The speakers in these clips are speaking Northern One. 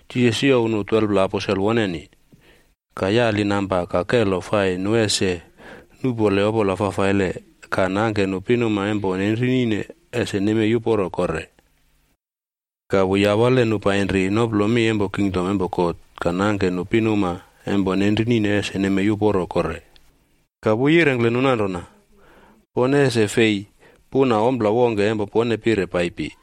Jisas youw nu 12pla aposel woneni, ka yali namba ka kelo fai nu ese nuꞌpole opola fafaile ka nemplekurune pinuma empo nenrinine ese nemei uporo kore. Ka wu yawale nu painri noplo mi empo kingdom empo God ka yemplekuruye pinuma empo nenrinine ese nemei uporo kore. Ka wu yirengkle nu nanrona, “Pone ese fei puna ompla wongke empo pone pire paipi.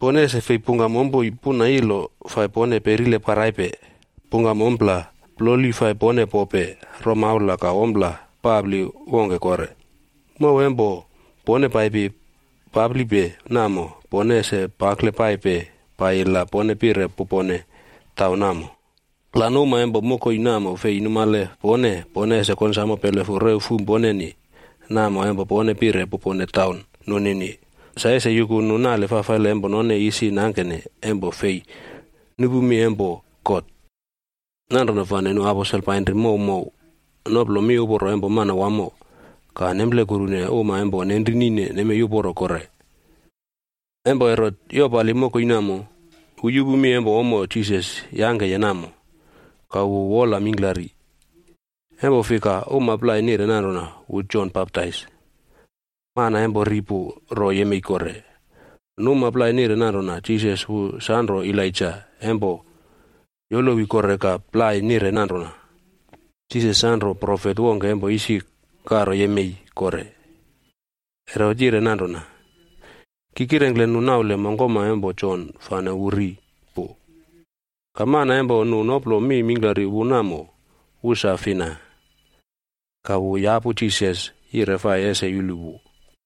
Pone ese fei pungkam ompoi, puna ilo fai pone perile paraipe, pungkam ompla ploli fai pone pope, romaula ka ompla papli wongke kore. Mow empo pone paipi paplipe namo, pone ese pakle paipe paiyi la pone pire pupone taun namo. La nu uma empo mokoi namo fei numale pone, pone ese konsamo pelefu rew fum ponenia namo empo pone pire pupone taun nunini sa ese yuku nu nale fafaile empo none isi nangkene empo fei nupu mi empo God.” Nanrona fane nu aposel painri mow mow noplo miuporo empo Manawamo ka nemplekurune uma empo nenrinine nemei uporo kore. Empo Herot yopali mokoi namo, wu yupu mi empo ommo Jisas yangkeye namo, ka wu wola mingklari, empo fika uma plai nire nanrona wu Jon Baptais, mana empo ri pu ro yemei kore. Nu uma plai nire nanrona Jisas wu sanro Elaija empo yolowi kore ka plai nire nanrona Jisas sanro profet wongke empo isi karo yemei kore. Herot yire nanrona, “Ki kirengkle nu naule mongkoma empo Jon fane wu ri pu, ka mana empo nu noplo mi mingklari wu namo, wu sa fina?” Ka wu yapu Jisas yire fai ese yulu wu.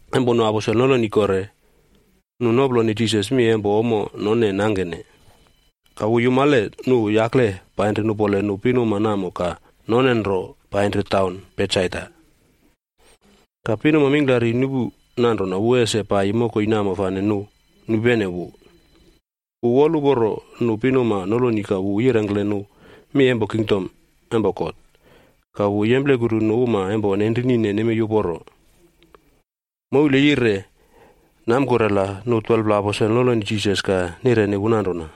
Empo nu aposel noloni kore, nu noploni Jisas mi empo ommo none nangkene. Ka wu yumale nu yakle painri nupole nu pinuma namo ka none nro painri taun Betsaida. Ka pinuma mingklari nupu nanrona wu ese paiyi mokoi namo fane nu nupene wu. Wu woluporo nu pinuma noloni ka wu yirengkle nu mi empo kingdom empo God, ka wu yemplekuru nu uma empo nenrinine nemei uporo. Moul yire namkurela nu 12pla aposel noloni Jisas ka nireni wu nanrona,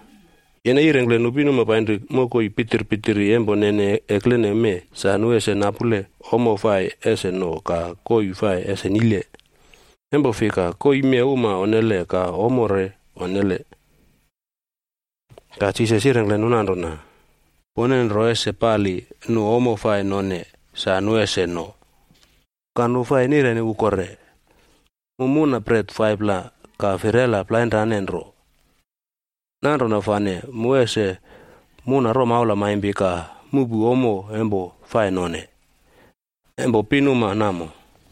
“Yene yirengkle nu pinuma painri mokoi pitirpitiri empo nene eklene mee sa nu ese napule ommo fai ese no ka koii fai ese nile. Empo fika koii mee uma onnele ka ommo re onnele.” Ka Jisas yirengkle nu nanrona, “Pone nro ese pali nu ommo fai none sa nu ese no.” Ka nu fai nireni wu kore, “Mu muna bret 5pla ka firela plainrane nro. Nanrona fane mu ese muna romaula maimpi ka muꞌpu ommo empo fai none, empo pinuma namo.”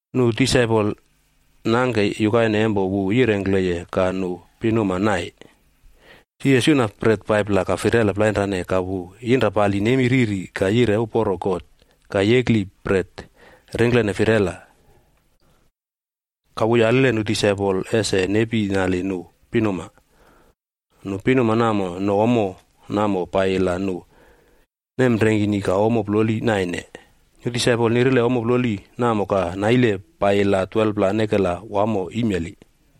Nu disaipol nangke yukaine empo wu yirengkleye ka nu pinuma nai. Jisas yuna bret 5pla ka firela plainrane ka wu yinrapali nemi riri ka yire uporo God ka yekli bret ringklene firela. Ka wu yaliye nu disaipol ese nepi nali nu pinuma. Nu pinuma namo no ommo namo paiyi la nu nemrengkini ka ommo ploli naine. Nu disaipol nirile ommo ploli namo ka naile paiyi la 12pla nekela wamo imeli.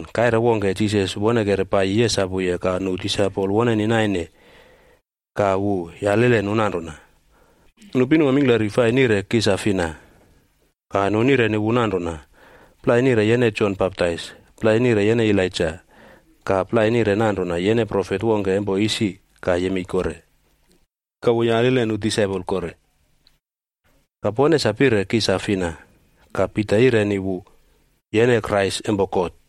Kaire wongke, Jisas wonekere paiyi yesapuye ka nu disaipol woneni naine ka wu yalile nu nanrona, “Nu pinuma mingklari fai nire ki sa fina?” Ka nu nireni wu nanrona, “Plai nire yene Jon Baptais, plai nire yene Elaija, ka plai nire nanrona yene profet wongke empo isi ka yemei kore.” Ka wu yalile nu disaipol kore, “Ka pone sa pire ki sa fina?” Ka Pita yireni wu, “Yene Krais empo God.”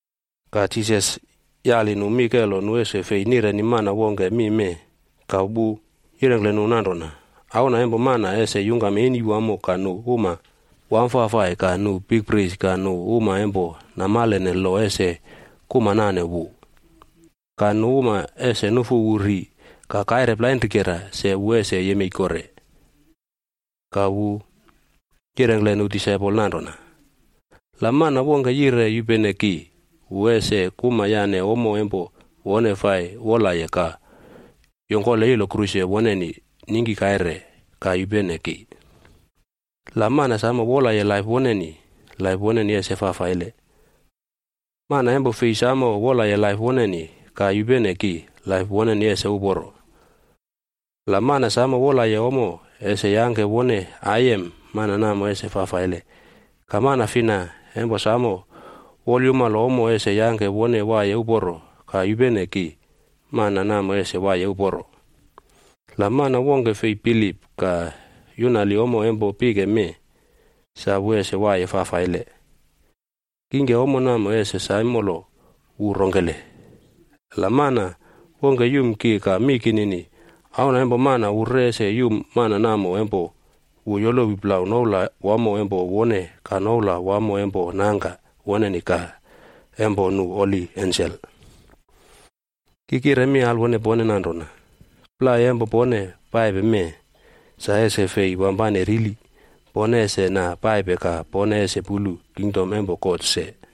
Ka Jisas yali nu mi kelo nu ese fei nireni mana wongke mi mee. Ka wu yirengkle nu nanrona, “Auna empo Mana ese yungkam eni mingklari ka nu uma wamfafai ka nu bikpris ka nu uma empo namalene lo ese kuma nane wu. Ka nu uma ese nufu wu ri ka kaire plainrikera se wu ese yemei kore.” Ka wu yirengkle nu disaipol nanrona, “La mana wongke yire yupene ki, wu ese kuma yane ommo empo wone fai wolaye ka yongkole ilo kruse woneni ningki kaire ka yupene ki. La mana samo wolaye laip woneni, laip woneni ese fafaile. Mana empo fei samo wolaye laip woneni, ka yupene ki, laip woneni ese uporo. La mana samo wolaye ommo ese yangke wone aiyem, mana namo ese fafaile. Ka mana fina empo samo wolyumalo ommo ese yangke wone waiye uporo ka yupene ki, mana namo ese waiye uporo. La mana wongke fei bilip ka yunali ommo empo pike mee sa wu ese waiye fafaile, kingke ommo namo ese saimolo wu rongkele? La mana wongke yum ki ka mi kinini, Auna empo Mana wu re ese yum mana namo empo wu yolowi plau noula wamo empo wone ka noula wamo empo Nangka woneni ka empo nu holi ensel. Ki kire mi alwone pone nanrona, plai empo pone paipe mee sa ese fei wampane rili, pone ese na paipe ka pone ese pulu kingdom empo God se.”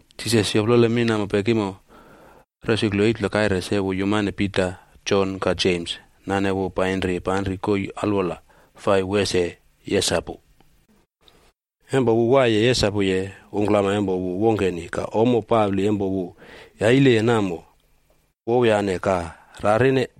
Jisas yoplole mi namo pekimo, resuklu 8pla kaire se wu yumane Pita, Jon ka Jems nane wu painri panri koii alwola fai wu ese yesapu. Empo wu waiye yesapuye, ungklama empo wu wongkeni ka ommo papli empo wu yaileye namo wowyane ka rarine.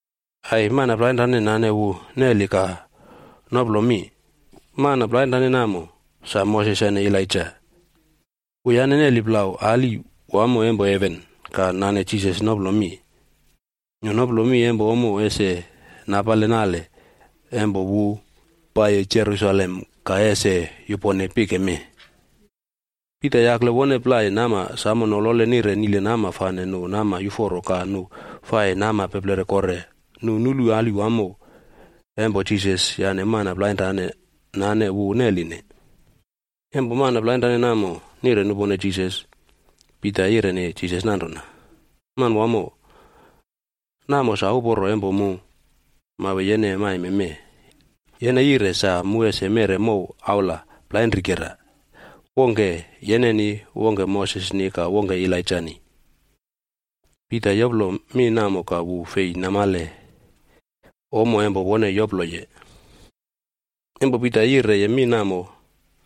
Ai! Mana plainrane nane wu neli ka noplo mi. Mana plainrane namo, sa Moses yane Elaija. Wuyane neli plau ali wamo empo heven ka nane Jisas noplo mi. Nu noplo mi empo ommo ese napale nale empo wu paiyi Jerusalem ka ese yupone pike mee. Pita yakle wone plai nama samo nolole nire nile nama fane nu nama yuforo, ka nu fai nama peplere kore, nu nulu ali wamo empo Jisas yane mana plainrane nane wu neline. Empo mana plainrane namo nire nupone Jisas, Pita yireni Jisas nanrona, “Manwamo, namo sa uporo empo mu mawe yene maime mee. Yene yire sa mu ese meꞌre mow aula plainrikera, wongke yeneni, wongke Mosesni ka wongke Elaijani.” Pita yoplo mi namo ka wu fei namale ommo empo wone yoploye. Empo Pita yireye mi namo,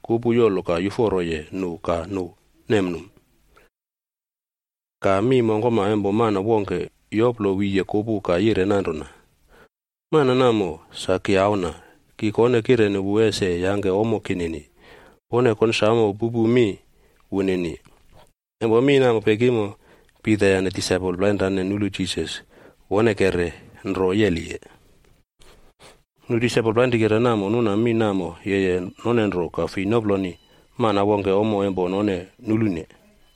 kupu yolo ka yuforoye nu ka nu nemnum. Ka mi mongkoma empo mana wongke yoplo wiye kupu ka yire nanrona, “Mana namo sa ki Auna, ki kone kem wu ese yangke ommo kinini. Pone konsamo pupu mi wunini.” Empo mi namo pekimo, Pita yane disaipol plainrane nulu Jisas wonekere nro yeliye. Nu disaipol plainrikera namo nuna mi namo yeye none nro ka fei noploni mana wongke ommo empo none nulune.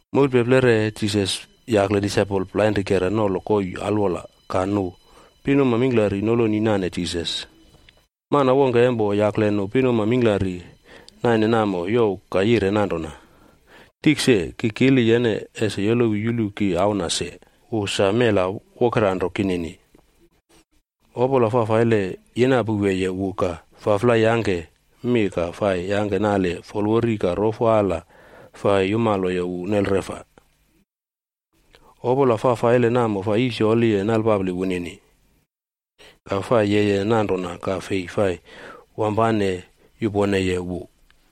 Moulpeplere Jisas yakle disaipol plainrikera nolo koii alwola ka nu pinuma mingklari noloni nane Jisas. Mana wongke empo yakle nu pinuma mingklari naine namo youw ka yire nanrona, “Tikse, ki kili yene ese yolowi yulu ki auna se, wu sa mela wokeranro kinini. Opola fafaile fai yinapouweye wu ka faflai yangke mi ka fai yangke nale folwori ka rofo ala fai yumaloye wu nelreꞌfa. Opola fafaile namo fai yisiyoli nalpapli wunini, ka fai yeye nanrona ka fei fai wampane yuponeye wu.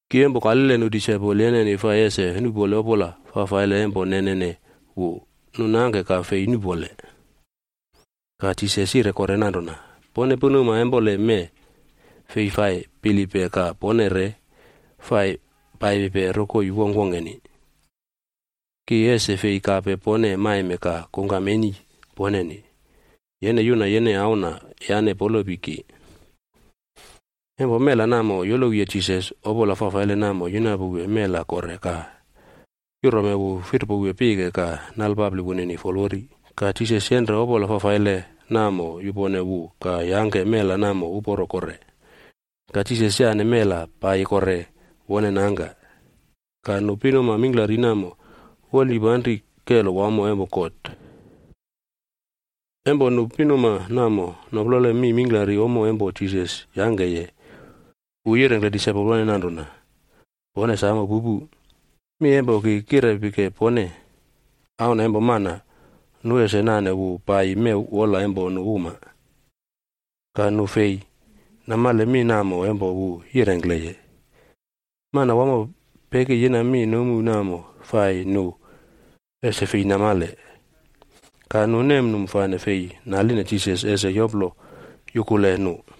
Ki empo kalile nu disaipol yeneni fai ese nuꞌpole opola fafaile empo nenene wu, nu nangke ka fei nuꞌpole.” Ka Jisas yire kore nanrona, “Pone pinuma empoleme fei fai bilippe ka pone re fai paipipe rokoi wongkwongkeni. Ki ese fei kape pone maime ka kungkam eni poneni. Yene yuna yene auna yane polopi ki.” Empo mela namo yolowiye Jisas, opola fafaile namo yinapouwe mela kore ka yurome wu firpowe pike ka nalpapli wunini folwori. Ka Jisas yenre opola fafaile namo yupone wu ka yangke mela namo uporo kore. Ka Jisas yane mela paiyi kore wone nangka. Ka nu pinuma mingklari namo wolnipanri kelo wamo empo God. Empo nu pinuma namo noplole mi mingklari ommo empo Jisas yangkeye, wu yirengkle disaipol woneni nanrona, “Pone samo pupu, mi empo ki kirepike pone: Auna empo Mana nu ese nane wu paiyi mew wola empo nu uma.” Ka nu fei namale mi namo empo wu yirengkleye. Manawamo peki yina mi nomu namo fai nu ese fei namale. Ka nu nemnum fane fei naline Jisas ese yoplo yukule nu.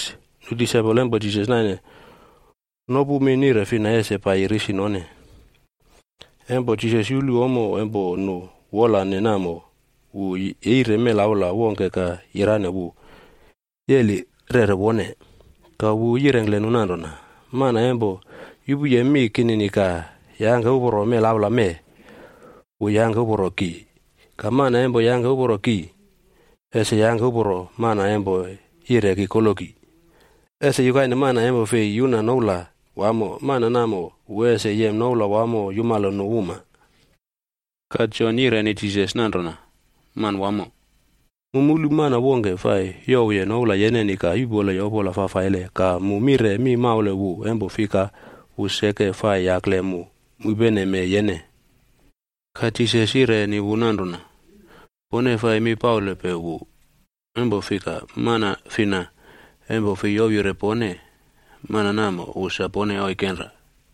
Nu disaipol empo Jisas naine nopu mi nire fina ese paiyi risi none. Empo Jisas yulu ommo empo nu wolane namo, wola wu yeire melaula wongke ka yirane wu yeli rere wone. Ka wu yirengkle nu nanrona, “Mana empo yupuye mi kinini ka yangke uporo melaula mee, wu yangke uporo ki. Ka mana empo yangke uporo ki, ese yangke uporo mana empo yire ki koloki. Ese yukaine mana empo fei yuna noula wamo, mana namo wu ese yem noula wamo yumalo nu uma.” Ka Jon yireni Jisas nanrona, “Manwamo, mu mulu mana wongke fai youwye noula yeneni ka yuꞌpoleye opola fafaile ka mu mire mi maule wu empo fika wu seke fai yakle mu mupeneme yene.” Ka Jisas yireni wu nanrona, “Pone fai mi paulepe wu, empo fika mana fina empo fei ouwyire pone, mana namo wu sa pone oikenra.”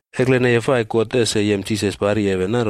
Ekleneye fai God ese yem Jisas pari heven,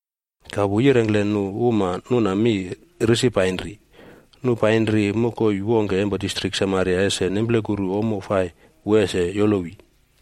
Ka wu yirengkle nu uma nuna mi risi painri. Nu painri mokoi wongke empo Samaria ese nemplekuru ommo fai wu ese yolowi.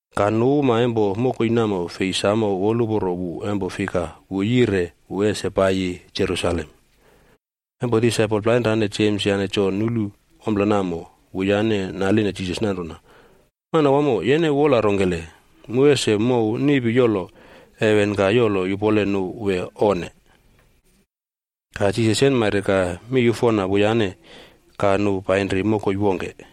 Ka nu uma empo mokoi namo fei samo woluporo wu empo fika wu yire wu ese paiyi Jerusalem.d Empo disaipol plainrane Jems yane Jon nulu ompla namo, wuyane naline Jisas nanrona, “Manawamo, yene wola rongkele, mu ese mouw niꞌpi yolo heven ka yolo yupole nu wee, onne?” Ka Jisas yenmaire ka miyufona wuyane, ka nu painri mokoi wongke.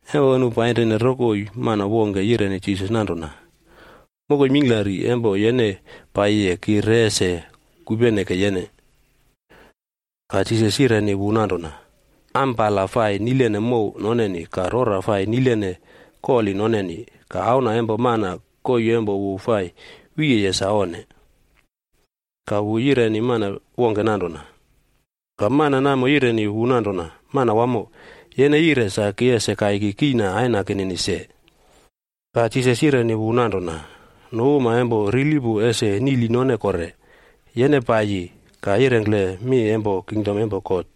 Empo nu painrine rokoi, mana wongke yireni Jisas nanrona, “Mokoi mingklari empo yene paiyiye ki re ese kupeneke yene.” Ka Jisas yireni wu nanrona, “Ampala fai nilene mow noneni, ka rora fai nilene koli noneni, ka Auna empo Mana koii empo wu fai wiyeye sa onne.” Ka wu yireni mana wongke nanrona, “Yupene ki.” Ka mana namo yireni wu nanrona, “Manawamo, yene yire sa ki ese kaiki kiꞌna aina kinini se.” Ka Jisas yireni wu nanrona, “Nu uma empo rili pu ese niꞌli none kore, yene paiyi ka yirengkle mi empo kingdom empo God.”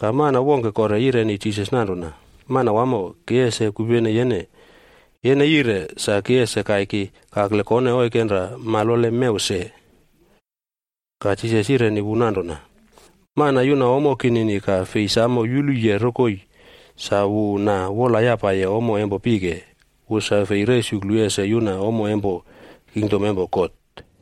Ka mana wongke kore yireni Jisas nanrona, “Manawamo, ki ese kupene yene. Yene yire sa ki ese kaiki kakle kone oikenra malole mew se.” Ka Jisas yireni wu nanrona, “Mana yuna ommo kinini ka fei samo yuluye rokoi sa wu na wolyapaye ommo empo pike, wu sa fei resuklu ese yuna ommo empo kingdom empo God.”